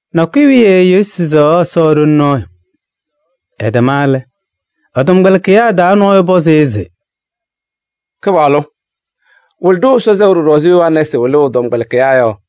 Nakʋyʋ wiye Yesu sɛɣaɣ Ɛsɔ ɖoli nɔɔyʋ. Ɛtɛma lɛ, ɛ-tɔmkpɛlɩkɩyaa taa nɔɔyʋ pɔzɩ-ɩ se: “Kɩpaɣlʋ! Wɩlɩ-ɖʋ Ɛsɔ sɛʋ ɖɔɖɔ ɛzɩ Yohanɛɛsɩ wɩlʋʋ ɛ-tɔmkpɛlɩkɩyaa yɔ.”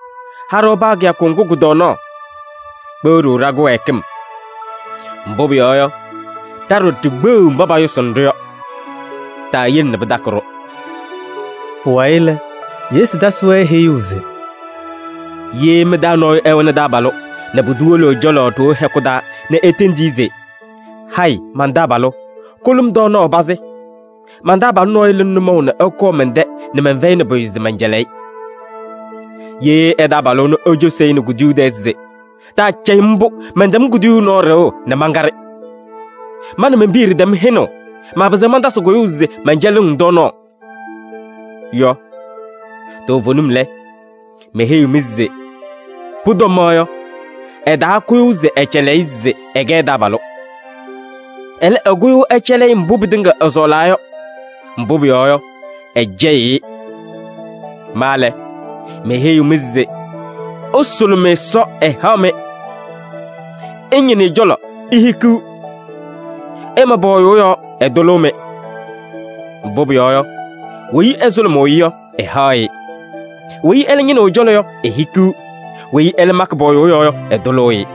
Ha-ɖʋ paa kɩyakʋ ŋgʋ kʋ-tɔɔnaɣ. Kpeɣ-ɖʋ ɖa-kɩwɛɛkɩm, mbʋ pʋyɔɔ yɔ, ɖa ɖɔɖɔ ɖikpeɣiɣ mba payʋsʋʋnɩ-ɖʋ yɔ. Taayele nɛ pɩtakɩ-ɖʋ.” Pʋwayɩ lɛ, Yesu tasɩ-wɛ heyuu se: “Ye mɩ-taa nɔɔyʋ ɛwɛnɩ taabalʋ nɛ pʋdʋ wolo ɛ-cɔlɔ ɖoo hɛkʋ taa nɛ etendi-i se: ‘Hayɩ, man-taabalʋ! Kʋlʋ-m tɔɔnaɣ pazɩ. Man-taabalʋ nɔɔyʋ lɩnɩ nʋmɔʋ nɛ ɛkɔɔ mɛn-tɛ nɛ mɛnfɛyɩnɩ pʋyʋ se mɛncɛlɩ-ɩ.’ Ye ɛ-taabalʋ ɛnʋ ecosi-i nɛ kuduyuu tɛɛ se: ‘Taacɛyɩ-m mbʋ, mɛntɛm kuduyuu nɔɔ ɖɩɣʋ nɛ mankaɖɩ. Ma nɛ men-piya ɖɩtɛm hɛnʋʋ, maapɩzɩɣ mantasɩ kʋyʋʋ se mɛncɛlɩɣ-ŋ tɔɔnaɣ’ yɔ, toovenim lɛ, meheyiɣ-mɩ se pʋtɔma yɔ, ɛtaakʋyʋʋ se ɛcɛlɩ-ɩ se ɛkɛ ɛ-taabalʋ. Ɛlɛ, ɛkʋyʋʋ ɛcɛlɩ-ɩ mbʋ pɩtɩŋa ɛsɔɔlaa yɔ, mbʋ pʋyɔɔ yɔ, ɛcɛyɩɣ-ɩ. Ma lɛ, meheyiɣ-mɩ se: ɩsʋlʋmɩ Ɛsɔ, ɛhaɣ-mɩ, ɩñɩnɩ ɛ-cɔlɔ, ihikiɣ, ɩma pɔɔyʋʋ yɔɔ, ɛtʋlʋʋ-mɩ. Mbʋ pʋyɔɔ yɔ, weyi ɛsʋlʋmʋʋ-ɩ yɔ, ɛhaɣ-ɩ, weyi ɛlɛ ñɩnɩɣ ɛ-cɔlɔ yɔ, ehikiɣ, weyi ɛlɛ makɩ pɔɔyʋʋ yɔɔ yɔ, ɛtʋlʋʋ-ɩ.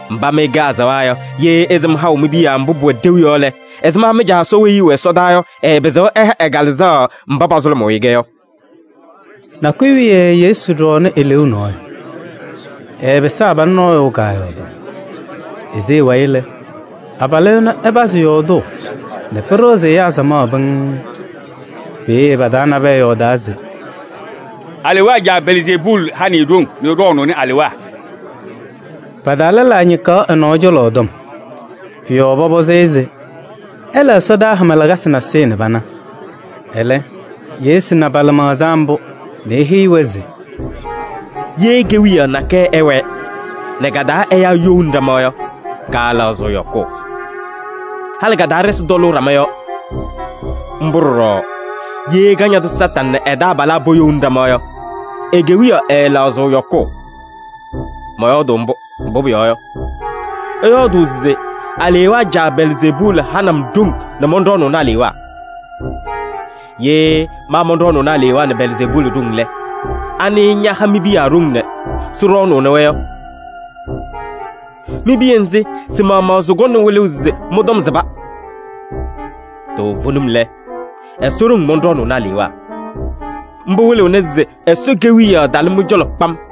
Mba mɩ ɩkɛ azaɣa yɔ, ye ɩsɩm haʋ mi-piya mbʋ pʋwɛ ɖeu yɔ lɛ, ɛzɩma mɩ-Caa Ɛsɔ weyi ɛwɛ ɛsɔdaa yɔ, ɛɛpɩzɩɣ ɛha ɛ-Kalɩzaɣ mba pasʋlʋmʋʋ-ɩ-kɛ yɔ?” Nakʋyʋ wiye Yesu ɖɔɔnɩ eleeu nɔɔyʋ. Ɛɛpɩsɩ abalʋ nɔɔyʋ kaayɔɔdaɣ. Ese ɛ-wayɩ lɛ, abalʋ ɛnʋ ɛpazɩ yɔɔdʋʋ nɛ pɩɖɩɣzɩ ɛyaa samaɣ pɩŋŋ. Peeye pa-taa nabɛyɛ yɔɔdaa se: “Alewaa caa Belzeebuuli hanɩ-ɩ ɖoŋ nɛ ɛɖɔɔnʋʋnɩ alewaa.” Pa-taa lɛlaa ñɩkaɣ ɛ-nɔɔ cɔlɔ tɔm. Pʋ-yɔɔ pɔpɔzɩ-ɩ se ɛla ɛsɔdaa hama lakasɩ nasɩyɩ nɛ pana. Ɛlɛ Yesu na pa-lɩmaɣza mbʋ nɛ eheyi-wɛ se: “Ye kewiyaɣ nakɛyɛ ɛwɛɛ nɛ ka-taa ɛyaa youni ɖama yɔ, kaalaɣzɩɣ yɔkʋʋ. Halɩ ka-taa ɖɩsɩ tɔlʋʋ ɖama yɔɔ. Mbʋ ɖɔɖɔ ye Kañadʋ Satanɩ nɛ ɛ-taabalaa poyouni ɖama yɔ, e-kewiyaɣ ɛɛlaɣzɩɣ yɔkʋʋ. Mɔyɔɔdʋʋ mbʋ, mbʋ pʋyɔɔ yɔ, ɩyɔɔdʋʋ se alewaa caa Belzeebuuli hanɩ-m ɖoŋ nɛ mɔnɖɔɔnʋʋnɩ alewaa. Ye ma mɔnɖɔɔnʋʋ alewaa nɛ Belzeebuuli ɖoŋ lɛ, anɩ ñaha mi-piya ɖoŋ nɛ sɩɖɔɔnʋʋnɩ-wɛ yɔ? Mi-piya nzɩ, sɩ-maɣmaɣ sɩkɔŋnɩ wɩlʋʋ se mɩ-tɔm sɩba. Toovenim lɛ, Ɛsɔ ɖoŋ mɔnɖɔɔnʋʋnɩ alewaa. Mbʋ wɩlɩɣna se Ɛsɔ Kewiyaɣ talɩ mɩ-cɔlɔ kpam.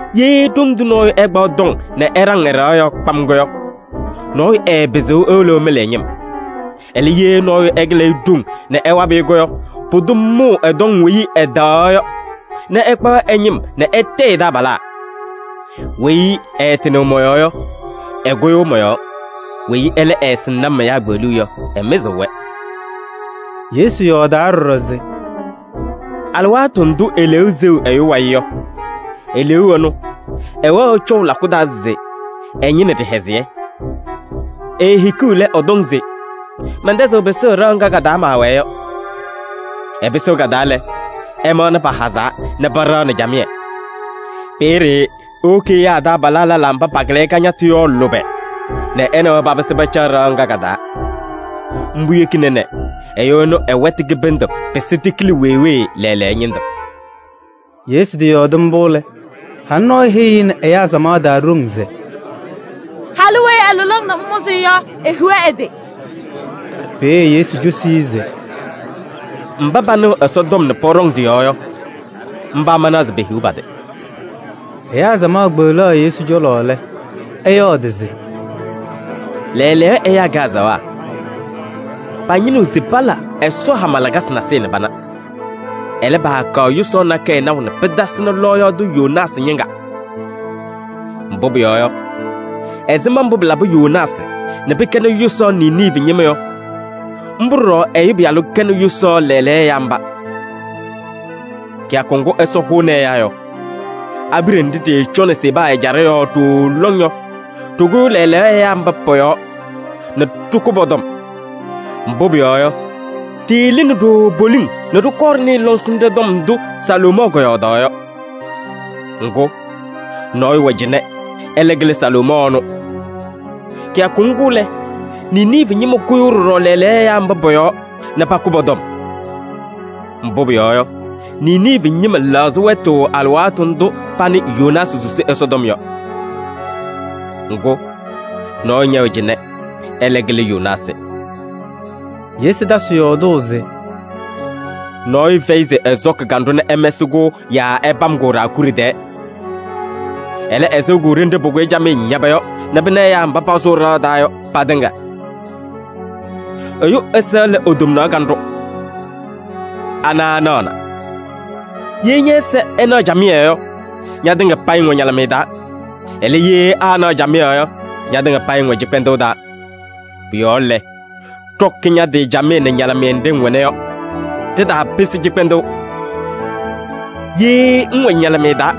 Ye ɖoŋ tʋ nɔɔyʋ ɛkpaɣ tɔŋ nɛ ɛɖaŋ ɛ-ɖɩɣa yɔɔ kpam yɔ, nɔɔyʋ ɛɛpɩzɩɣ ewolo ɛmɩlɩ ɛ-ñɩm. Ɛlɛ, ye nɔɔyʋ ɛkɩlɩ-ɩ ɖoŋ nɛ ɛwabɩ-ɩ yɔ, pʋdʋ mʋʋ ɛ-tɔŋ weyi ɛtaɣaɣ yɔ nɛ ɛkpaɣ ɛ-ñɩm nɛ ɛtayɩ ɛ-taabalaa. Weyi ɛɛtɩnɩɣ mɔ-yɔɔ yɔ, ɛkʋyʋʋ mɔ-yɔɔ. Weyi ɛlɛ ɛɛsɩŋnɩ-m ɛyaa kpeɣluu yɔ, ɛmɩzɩɣ-wɛ.” Yesu yɔɔdaa ɖɔɖɔ se: “Alɩwaatʋ ndʋ eleeu seɣ ɛyʋ wayɩ yɔ, eleeu ɛnʋ ɛwɛɣ ɛcɔʋ lakʋ taa se ɛñɩnɩ ɖɩhɛzɩyɛ. Eehikiɣ lɛ, ɛtɔŋ se: ‘Mɛntɛzɩɣ pɩsʋʋ ɖɩɣa ŋga ka-taa maawɛɛ yɔ.’ Ɛpɩsɩɣ ka-taa lɛ, ɛmaɣna pahazaa nɛ paɖaɣnɩ camɩyɛ. Peeye ewoki ɛyaa ɛ-taabalaa lɛlaa mba pakɩlɩ-ɩ kañatʋ yɔ lʋbɛ nɛ ɛ nɛ wɛ papɩsɩ pacaɣ ɖɩɣa ŋga ka-taa. Mbʋ yekina nɛ ɛyʋ ɛnʋ ɛ-wɛtʋ kɩbɩndʋ pɩsɩ tɩkɩlɩ wee wee lɛɛlɛɛyɔ ñɩndʋ.” Yesu tɩyɔɔdɩ mbʋ lɛ, halʋ nɔɔyʋ heyi-i nɛ ɛyaa samaɣ taa ɖoŋ se: “Halʋ weyi ɛlʋlɩ-ŋ nɛ ŋmʋzɩ-ɩ yɔ, ehiɣ ɛ-tɩ!” Peeye Yesu cosi-i se: “Mba panɩɣ Ɛsɔtɔm nɛ pɔɖɔŋ tɩ-yɔɔ yɔ, mba manaɣ se pehiɣ pa-tɩ.” Ɛyaa samaɣ kpeɣlaɣ Yesu cɔlɔ lɛ, ɛyɔɔdɩ se: “Lɛɛlɛɛyɔ ɛyaa kɛ azaɣa pañɩnɩɣ se pala ɛsɔdaa hama lakasɩ nasɩyɩ nɛ pana. Ɛlɛ, paakaɣ yʋsaɣ nakɛyɛ naʋ nɛ pɩtasɩnɩ lɔɔyaɣ tʋ Yoonaasɩ ñɩŋga. Mbʋ pʋyɔɔ yɔ, ɛzɩma mbʋ pɩlabɩ Yoonaasɩ nɛ pɩkɛnɩ yʋsaɣ Niniivi ñɩma yɔ, mbʋ ɖɔɖɔ Ɛyʋ Pɩyalʋ kɛnɩ yʋsaɣ lɛɛlɛɛyɔ ɛyaa mba. Kɩyakʋ ŋgʋ Ɛsɔ hʋʋnɩ ɛyaa yɔ, abiɖe nɖɩ ɖɩɩcɔnɩ Seba ɛjaɖɛ yɔɔ ɖooo lɔŋ yɔ, ɖɩkʋyʋʋ lɛɛlɛɛyɔ ɛyaa mba pɔ-yɔɔ nɛ ɖɩkʋ pɔ-tɔm. Mbʋ pʋyɔɔ yɔ, ɖɩɩlɩnɩ ɖooo poliŋ nɛ ɖɩkɔɔ ɖɩnɩɩ lɔŋsɩnɖɛ tɔm ndʋ Salomɔɔ kɔyɔɔdaɣ yɔ. Ŋgʋ, nɔɔyʋ wɛ cɩnɛ, ɛlɛ kɩlɩ Salomɔɔ ɛnʋ. Kɩyakʋ ŋgʋ lɛ, Niniivi ñɩma kʋyʋʋ ɖɔɖɔ lɛɛlɛɛyɔ ɛyaa mba pɔ-yɔɔ nɛ pakʋ pɔ-tɔm. Mbʋ pʋyɔɔ yɔ, Niniivi ñɩma lɛɣzɩ wɛtʋ alɩwaatʋ ndʋ panɩ Yoonaasɩ susi Ɛsɔtɔm yɔ. Ŋgʋ, nɔɔyʋ ñɛwɛ cɩnɛ, ɛlɛ kɩlɩ Yoonaasɩ.” Yesu tasɩ yɔɔdʋʋ se: “Nɔɔyʋ fɛyɩ se ɛsɔkɩ kanɖʋ nɛ ɛmɛsɩ-kʋ yaa ɛpam-kʋ ɖaakuɖe tɛɛ. Ɛlɛ, ɛsɩɣ-kʋ ɖenɖe pʋkʋyɩ camɩyɛ ñaba yɔ nɛ pɩna ɛyaa mba pasʋʋ ɖɩɣa taa yɔ patɩŋa. Ɛyʋ ɛza lɛ e-tomnaɣ kanɖʋ, ana ɛnaɣna. Ye ñɛ-ɛza ɛnaɣ camɩyɛ yɔ, ñatɩŋa payɩ ŋwɛ ñalɩmɩyɛ taa. Ɛlɛ, ye aanaɣ camɩyɛ yɔ, ñatɩŋa payɩ ŋwɛ cɩkpɛndʋʋ taa. Pʋ-yɔɔ lɛ, ɖɔkɩ ña-tɩ camɩyɛ nɛ ñalɩmɩyɛ nɖɩ ŋwɛna yɔ, ɖɩtaapɩsɩ cɩkpɛndʋʋ. Ye ŋwɛ ñalɩmɩyɛ taa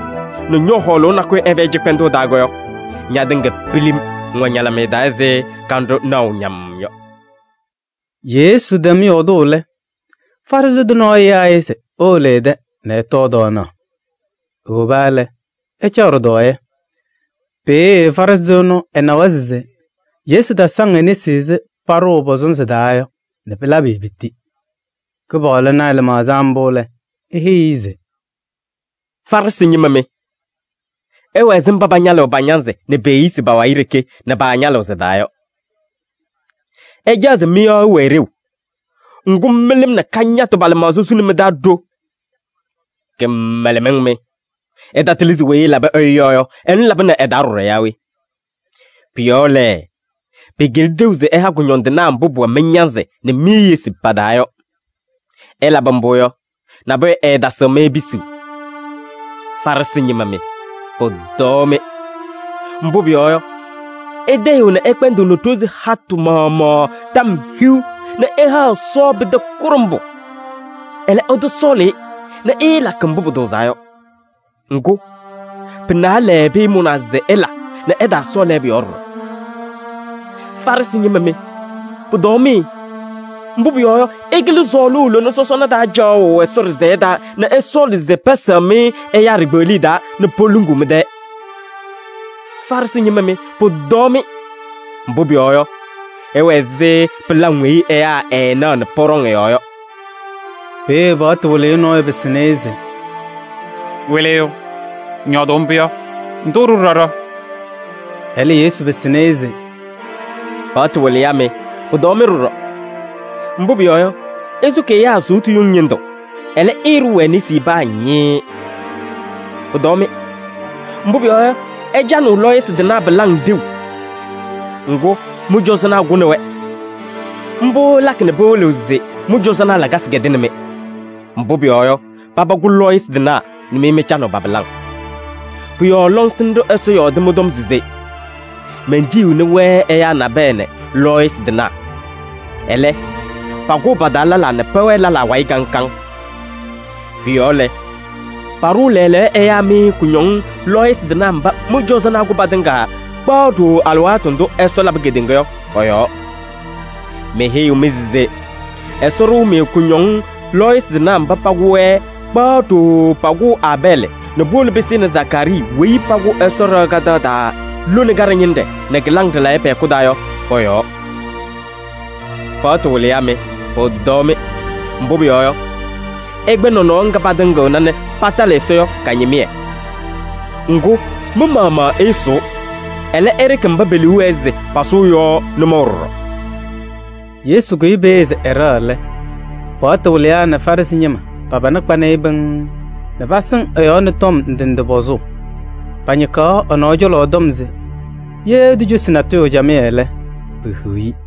nɛ ñɔ-hɔɔlʋʋ nakʋyʋ ɛfɛyɩ cɩkpɛndʋʋ taa yɔ, ñatɩŋa pilim ŋwɛ ñalɩmɩyɛ taa ɛzɩ kanɖʋ naɣʋ-ŋ ñamm yɔ.” Yesu tɛm yɔɔdʋʋ lɛ, Farɩsɩ tʋ nɔɔyʋ yaa-ɩ se ewolo ɛ-tɛ nɛ ɛtɔɔ tɔɔnaɣ. Ewoba lɛ, ɛcaɣ ɖɩtɔɔyɛ. Peeye Farɩsɩ tʋ ɛnʋ ɛnawa se Yesu tasaŋ e-nesi ɛzɩ paɖʋʋ pɔ-sɔnzɩ taa yɔ nɛ pɩlabɩ-ɩ piti. Kɩpaɣlʋ na ɛ-lɩmaɣza mbʋ lɛ, eheyi-i se: “Farɩsɩ ñɩma mɩ! Ɩwɛ ɛzɩ mba pañalɩɣ pa-ñanzɩ nɛ pe-eyisi pa-wayɩ ɖeke nɛ paañalɩɣ sɩ-taa yɔ. Ɩcaɣ se mɩ-yɔɔ ɛwɛɛ ɖeu, ŋgʋ mɩlɩm nɛ kañatʋ pa-lɩmaɣza suni mɩ-taa ɖo. Kɩmɛlɛmɩŋ mɩ! Ɩtatɩlɩ se weyi ɛlabɩ ɛyʋ yɔɔ yɔ, ɛnʋ labɩnɩ ɛ-taa ɖɔɖɔ yaa we? Pʋ-yɔɔ lɛ, pɩkɩlɩ ɖeu se ɩha kʋñɔndɩnaa mbʋ pʋwɛ mɩ-ñanzɩ nɛ mi-eyisi pa-taa yɔ. Ɩlabɩ mbʋ yɔ, nabʋyʋ ɛɛtasɩɣ-mɩ pisuu. Farɩsɩ ñɩma mɩ, pʋtɔɔ-mɩ! Mbʋ pʋyɔɔ yɔ, ɩtayɩɣ nɛ ɩkpɛndɩɣnɩ ɖozi hatʋ maɣmaɣ tɔm hiu nɛ ɩhaɣ Ɛsɔ pɩtɛ kʋɖʋmbʋ. Ɛlɛ, ɩtɔsɔɔlɩ-ɩ nɛ ɩɩlakɩ mbʋ pʋtʋʋzaa yɔ. Ŋgʋ, pɩ-naalɛ pɩɩmʋnaa se ɩla nɛ ɩtaasɔɔ lɛɛbʋ yɔɔ ɖɔɖɔ. Farɩsɩ ñɩma mɩ, pʋtɔɔ-mɩ! Mbʋ pʋyɔɔ yɔ, ɩkɩlɩ sɔɔlʋʋ lona sɔsɔna taa caɣʋ Ɛsɔ ɖɩsɛyɛ taa nɛ ɩsɔɔlɩ se pɛsɛɣ-mɩ ɛyaa ɖikpeɣliye taa nɛ poluŋuu mɩ-tɛɛ. Farɩsɩ ñɩma mɩ, pʋtɔɔ-mɩ! Mbʋ pʋyɔɔ yɔ, ɩwɛ ɛzɩ pɩlaŋ weyi ɛyaa ɛɛnaɣ nɛ pɔɖɔŋ ɩ-yɔɔ yɔ.” Peeye paɣtʋ wɩlɩyʋ nɔɔyʋ pɩsɩnɩ-ɩ se: “Wɩlɩyʋ! Ŋyɔɔdʋʋ mbʋ yɔ, ŋtʋ-ɖʋ ɖɔɖɔ.” Ɛlɛ Yesu pɩsɩnɩ-ɩ se: “Paɣtʋ wɩlɩyaa mɩ, pʋtɔɔ-mɩ ɖɔɖɔ! Mbʋ pʋyɔɔ yɔ, ɩsʋkɩ ɛyaa sʋʋtʋ yuŋ ñɩndʋ, ɛlɛ, ɩɩɖʋʋ-wɛ nesi paa ñɩɩɩ. Pʋtɔɔ-mɩ! Mbʋ pʋyɔɔ yɔ, ɩcanɩɣ lɔɔyɩsɩ tɩnaa pɩlaŋ ɖeu. Ŋgʋ, mɩ-cɔzɔnaa kʋnɩ-wɛ. Mbʋ ɩlakɩ nɛ pɩwɩlɩɣ se mɩ-cɔzɔnaa lakasɩ kɛdɩnɩ-mɩ. Mbʋ pʋyɔɔ yɔ, paba kʋ lɔɔyɩsɩ tɩnaa nɛ mɩ mɩcanɩɣ pa-pɩlaŋ. Pʋ-yɔɔ lɔŋsɩnɖʋ Ɛsɔ yɔɔdɩ mɩ-tɔm se: ‘Mentiyiɣni-wɛ ɛyaa nabɛyɛ nɛ lɔɔyɩsɩ tɩnaa. Ɛlɛ, pakʋʋ pa-taa lɛlaa nɛ pɛwɛɛ lɛlaa wayɩ kaŋ kaŋ.’ Pʋ-yɔɔ lɛ, paɖʋʋ lɛɛlɛɛyɔ ɛyaa mɩ kʋñɔŋ lɔɔyɩsɩ tɩnaa mba mɩ-cɔzɔnaa kʋ patɩŋa kpaɣ ɖooo alɩwaatʋ ndʋ Ɛsɔ labɩ kedeŋa yɔ pɔ-yɔɔ. Meheyiɣ-mɩ se: Ɛsɔ ɖʋʋ-mɩ kʋñɔŋ lɔɔyɩsɩ tɩnaa mba pakʋ-wɛ kpaɣ ɖooo pakʋʋ Aabɛɛlɩ nɛ puwolo pɩsɩnɩ Zakaarii weyi pakʋ Ɛsɔ ɖɩɣa kadaɣ taa lone kaɖɛ ñɩnɖɛ nɛ kɩlaŋ ɖɩlayɛ pɛ-hɛkʋ taa yɔ pɔ-yɔɔ. Paɣtʋ wɩlɩyaa mɩ, pʋtɔɔ-mɩ! Mbʋ pʋyɔɔ yɔ, ɩkpɛ nɔnɔɔ ŋga patɩŋɩɣna nɛ patɩlɩ Ɛsɔ yɔ ka-ñɩmɩyɛ. Ŋgʋ, mɩ-maɣmaɣ ɩɩsʋʋ, ɛlɛ ɩɖɩkɩ mba pe-liu wɛɛ se pasʋʋ yɔ nʋmɔʋ ɖɔɖɔ.” Yesu kʋyɩ peeye se ɛɖɛɣ lɛ, paɣtʋ wɩlɩyaa nɛ Farɩsɩ ñɩma pa-pana kpanɩ-ɩ pɩŋŋ nɛ pasɩŋ ɛ-yɔɔ nɛ tɔm ndɩ ndɩ pɔzʋʋ. Pañɩkaɣ ɛ-nɔɔ cɔlɔ tɔm se ye etocosi natʋyʋ camɩyɛ lɛ, pehiɣ-i.